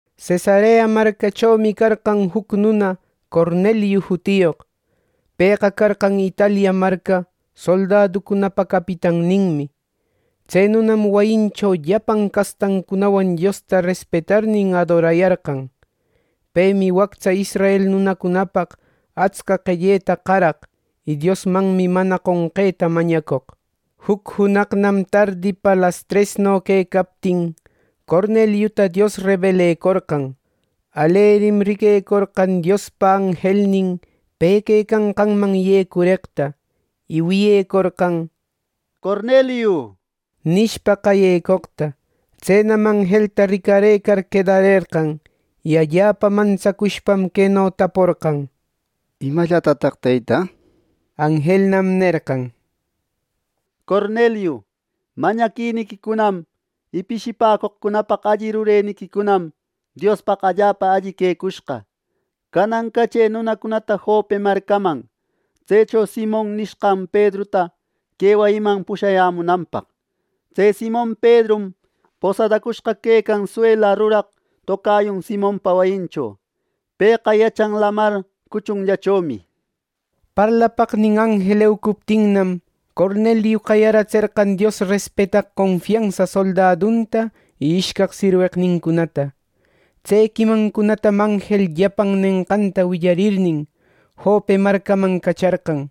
Cesarea marcachomi carqan juc nuna Corneliu jutiyoq. Pëqa carqan Italia marca soldaduncunapa capitanninmi. Tse nunam wayincho llapan castancunawan Diosta respetarnin, adorayarqan. Pemi wactsa israel nunacunapaq atsca qelleta qaraq y Diosmanmi mana qonqeta mañacoq. Juc junaqnam tardipa lastresno quecaptin, Corneliuta Dios rebelecorqan. Alerim riquecorqan Diospa anjelnin pe quecanqanman yecureqta, y wiyecorqan “Corneliu” nishpa qayecoqta. Tsenam anjelta ricarëcar quedarerqan, y allapa mantsacushpam, queno taporqan: —¿Imallatataq, Teyta? —nishpa. Anjelnam nerqan: —Corneliu, mañaquiniquicunam y pishipäcoqcunapaq alli rureniquicunam Diospaq allapa alli quecushqa. Canan cachë nunacunata Jope marcaman, tsecho Simon niyashqan Pedruta que wayiquiman pushayämunanpaq. Tse Simon Pedrum posadacushqa quecan suela ruraq tocayun Simonpa wayincho. Pëqa yachan lamar cuchunllachomi —nir. Parlapaqnin anjel eucuptinnam, Corneliu qayaratserqan Dios respetaq confiansa soldadunta y ishcaq sirweqnincunata. Tse quimancunatanam anjel llapan nenqanta willarirnin, Jope marcaman cacharqan.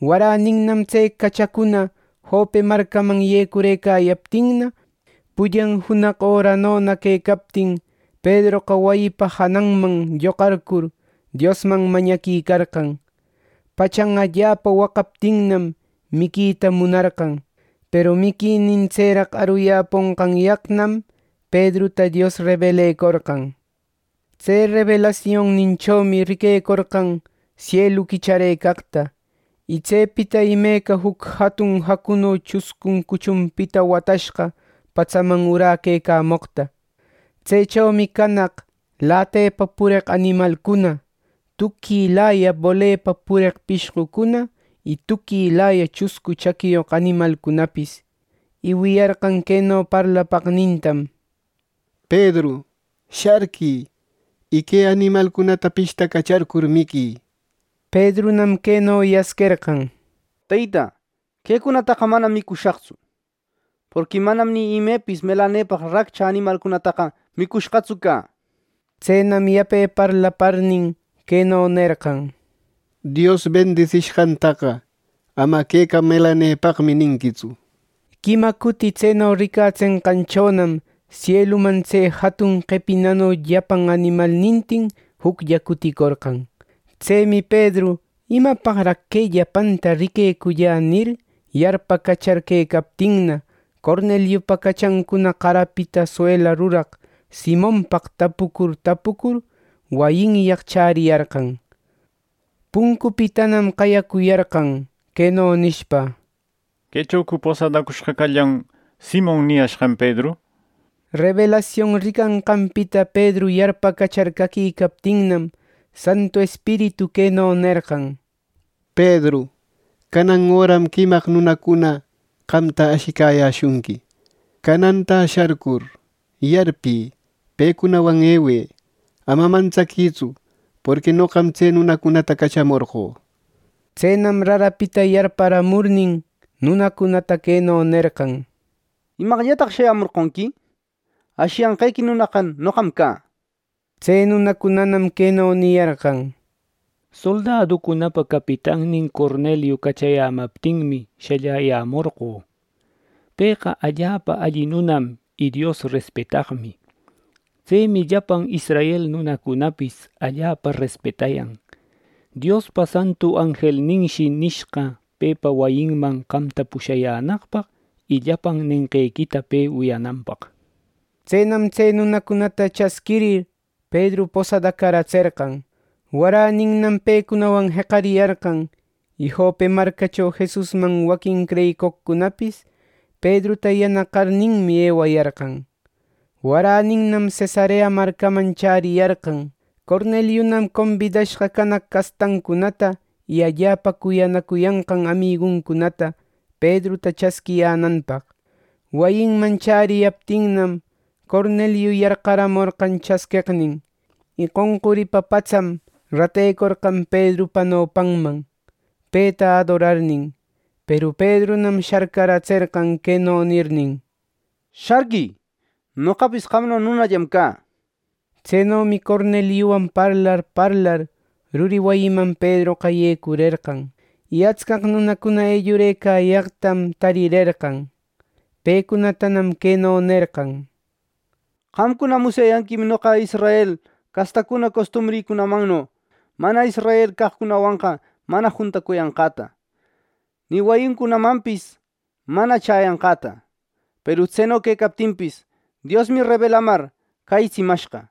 Waräninnam tse cachacuna Jope marcaman yecurëcayaptinna, pullan junaq öranona quecaptin, Pedroqa wayipa jananman lloqarcur, Diosman mañaquicarqan. Pachan allapa waqaptinnam, miquita munarqan. Peru miquinin tseraq aruyäponqanyaqnam, Pedruta Dios rebelecorqan. Tse rebelasionninchomi riquecorqan sielu quicharëcaqta, y tsepita imeca juc jatun jacuno chuscun cuchunpita watashqa patsaman uräquecamoqta. Tsechomi canaq lätepa pureq animalcuna, tuquilaya bolepa pureq pishqucuna, y tuquilaya chuscu chaquiyoq animalcunapis. Y wiyarqan queno parlapaqnintam: —Pedru, sharquï, y que animalcunata pishtacacharcur miquï —neqta. Pedrunam queno yasquerqan: —Teyta, ¡quecunataqa manam micushaqtsu; porqui manam ni imepis melanepaq raccha animalcunataqa micushqatsu cä! Tsenam yape parlaparnin, queno nerqan: —Dios bendisishqantaqa ama “Queqa melanepaqmi” ninquitsu —nir. Quima cuti tseno ricatsenqanchonam sieluman tse jatun qepinano llapan animalnintin juclla cuticorqan. Tsemi Pedru “¿Imapaqraq que llapanta riquecülla?” nir, yarpacachar quecaptinna, Corneliupa cachancuna qarapita suela ruraq Simonpaq tapucur tapucur wayinyaq chäriyarqan. Puncupitanam qayacuyarqan, queno nishpa: —¿Quechocu posadacushqa callan Simon niyashqan Pedru? —nir. Rebelasion ricanqanpita Pedru yarpacachar caquicaptinnam, Santu Espiritu queno nerqan: —Pedru, canan öram quimaq nunacuna qamta ashicayäshunqui. Canantä sharcur, yarpï. Pecunawan ewë; ama mantsaquïtsu; porqui noqam tse nunacunata cachamorqö —nishpa. Tsenam rarapita yarparamurnin, nunacunata queno nerqan: —¿Imaqllataq shayämorqonqui? Ashiyanqequi nunaqa noqam cä —nishpa. Tse nunacunanam queno niyarqan: —Soldaducunapa capitannin Corneliu cachayämaptinmi shalläyämorqö. Pëqa allapa alli nunam y Dios respetaqmi. Tsemi llapan israel nunacunapis allapa respetayan. Diospa santu anjelninshi nishqa pepa wayinman qamta pushayänaqpaq y llapan nenqequita pe wiyananpaq. Tsenam tse nunacunata chasquirir, Pedru posadacaratserqan. Waräninnam pecunawan jeqariyarqan; y Jope marcacho Jesusman waquin creyicoqcunapis Pedruta yanaqarninmi ewayarqan. Waräninnam Cesarea marcaman chäriyarqan. Corneliunam combidashqa canaq castancunata y allapa cuyanacuyanqan amiguncunata Pedruta chasquiyänanpaq. Wayinman chäriyaptinnam, Corneliu yarqaramorqan chasqueqnin; y qonquripa patsam ratecorqan Pedrupa nopanman, peta adorarnin. Peru Pedrunam sharcaratserqan, queno nirnin: —Sharquï; noqapis qamno nunallam cä —nishpa. Tsenomi Corneliuwan parlar parlar ruri wayiman Pedroqa yecurerqan; y atscaq nunacuna ellurëcayaqtam tarirerqan. Pecunatanam queno nerqan: —Qamcuna musyayanquim noqa israel castacuna costumbrïcunamanno mana israel caqcunawanqa mana juntacuyanqäta, ni wayincunamanpis mana chäyanqäta. Peru tseno quecaptinpis, Diosmi rebelamar cäyitsimashqa,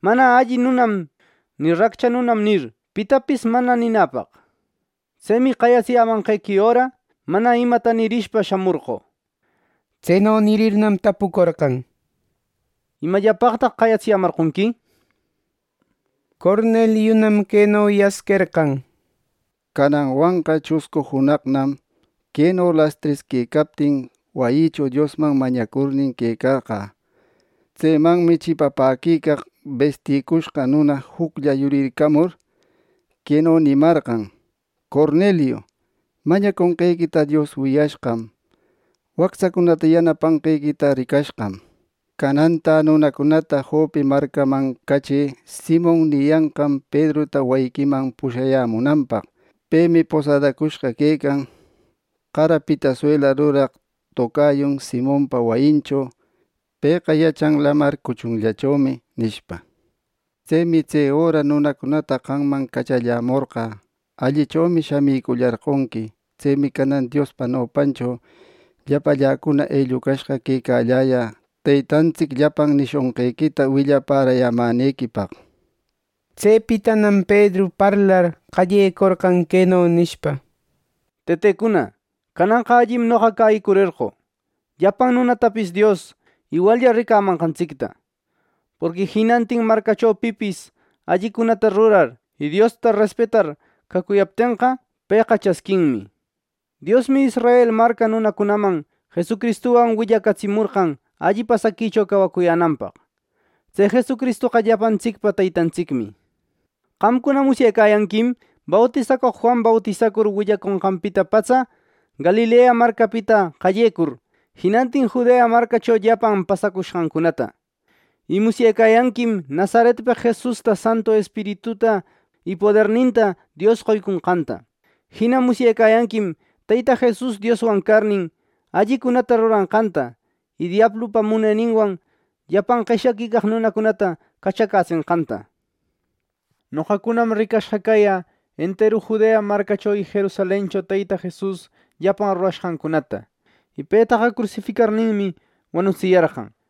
‘mana alli nunam’ ni ‘raccha nunam’ nir, pitapis mana ninäpaq. Tsemi qayatsiyämanquequi öra, mana imata nirishpa shamorqö —nir. Tseno nirirnam, tapucorqan: —¿Imallapaqtaq qayatsiyämarqonqui? —nishpa. Corneliunam queno yasquerqan: —Cananwanqa chuscu junaqnam, queno lastres quecaptin, wayïcho Diosman mañacurnin quecanqä. Tsemanmi chipapäquicaq besticushqa nuna juclla yurircamur, queno nimarqan: ‘Corneliu, mañaconqequita Dios wiyashqam, y wactsacunata yanapanqequita ricashqam. Canantä nunacunata Jope marcaman cachë Simon niyanqan Pedruta wayiquiman pushayämunanpaq. Pemi posadacushqa quecan qarapita suela ruraq tocayun Simonpa wayincho. Pëqa yachan lamar cuchunllachomi,’ nishpa. Tsemi tse öra nunacunata qamman cachallämorqä. Allichomi shamicullarqonqui. Tsemi canan Diospa nopancho llapalläcuna ellucashqa quecalläyä Teytantsic llapan nishonqequita willapärayämänequipaq —nir. Tsepitanam Pedru parlar qallecorqan, queno nishpa: —Tëtecuna, cananqa allim noqa cäyicurerqö llapan nunatapis Dios iwallla ricamanqantsicta. Porqui jinantin marcacho pipis allicunata rurar y Diosta respetar cacuyaptenqa, pëqa chasquinmi. Diosmi Israel marca nunacunaman Jesucristuwan willacatsimorqan alli pasaquicho cawacuyänanpaq. Tse Jesucristoqa llapantsicpa Teytantsicmi. Qamcuna musyecayanquim bautisacoq Juan bautisacur willaconqanpita patsa, Galilea marcapita qallecur, jinantin Judea marcacho llapan pasacushqancunata. Y musyecayanquim Nazaretpeq Jesusta Santu Espirituta y poderninta Dios qoyconqanta. Jina musyecayanquim Teyta Jesus Dioswan carnin, allicunata ruranqanta y diablupa muneninwan llapan qeshyaquicaq nunacunata cachacätsenqanta. Y noqacunam ricashqa cayä enteru Judea marcacho y Jerusalencho Teyta Jesus llapan rurashqancunata. Y petaqa crusificarninmi, wanutsiyarqan.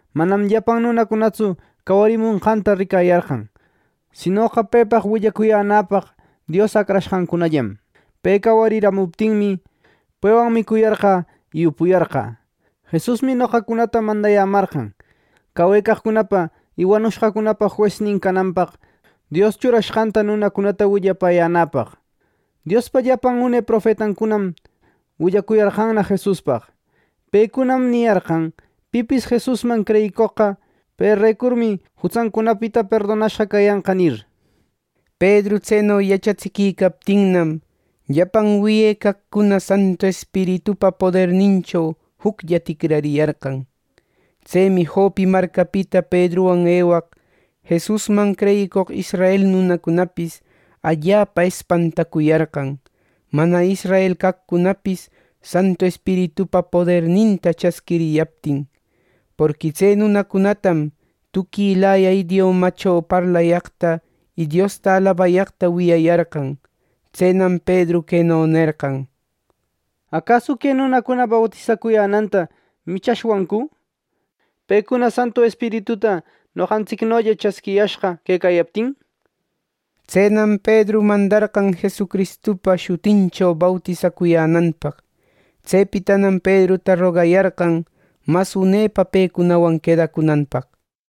Manam llapan nunacunatsu cawarimushqanta ricayarqan, sinoqa pepaq willacuyänäpaq Dios acrashqancunallam. Pe cawariramuptinmi, pewan micuyarqä y upuyarqä. Jesusmi noqacunata mandayämarqan, cawecaqcunapa y wanushqacunapa juesnin cananpaq Dios churashqanta nunacunata willapäyänäpaq. Diospa llapan une profetancunam willacuyarqanna Jesuspaq. Pecunam niyarqan pipis Jesusman creyicoqqa, perecurmi jutsancunapita perdonashqa cayanqa —nir. Pedru tseno yachatsiquicaptinnam, llapan wiyecaqcuna Santu Espiritupa podernincho juclla ticrariyarqan. Tsemi Jope marcapita Pedruwan ewaq Jesusman creyicoq israel nunacunapis allapa espantacuyarqan, mana israel caqcunapis Santu Espiritupa poderninta chasquiriyaptin. Porqui tse nunacunatam tuquilaya idiomacho parlayaqta y Diosta alabayaqta wiyayarqan. Tsenam Pedru queno nerqan: —¿Acasu que nunacuna bautisacuyänanta michashwancu, pecuna Santu Espirituta noqantsicnolla chasquiyashqa quecayaptin? —nir. Tsenam Pedru mandarqan Jesucristupa shutincho bautisacuyänanpaq. Tsepitanam Pedruta rogayarqan mas unepa pecunawan quedacunanpaq.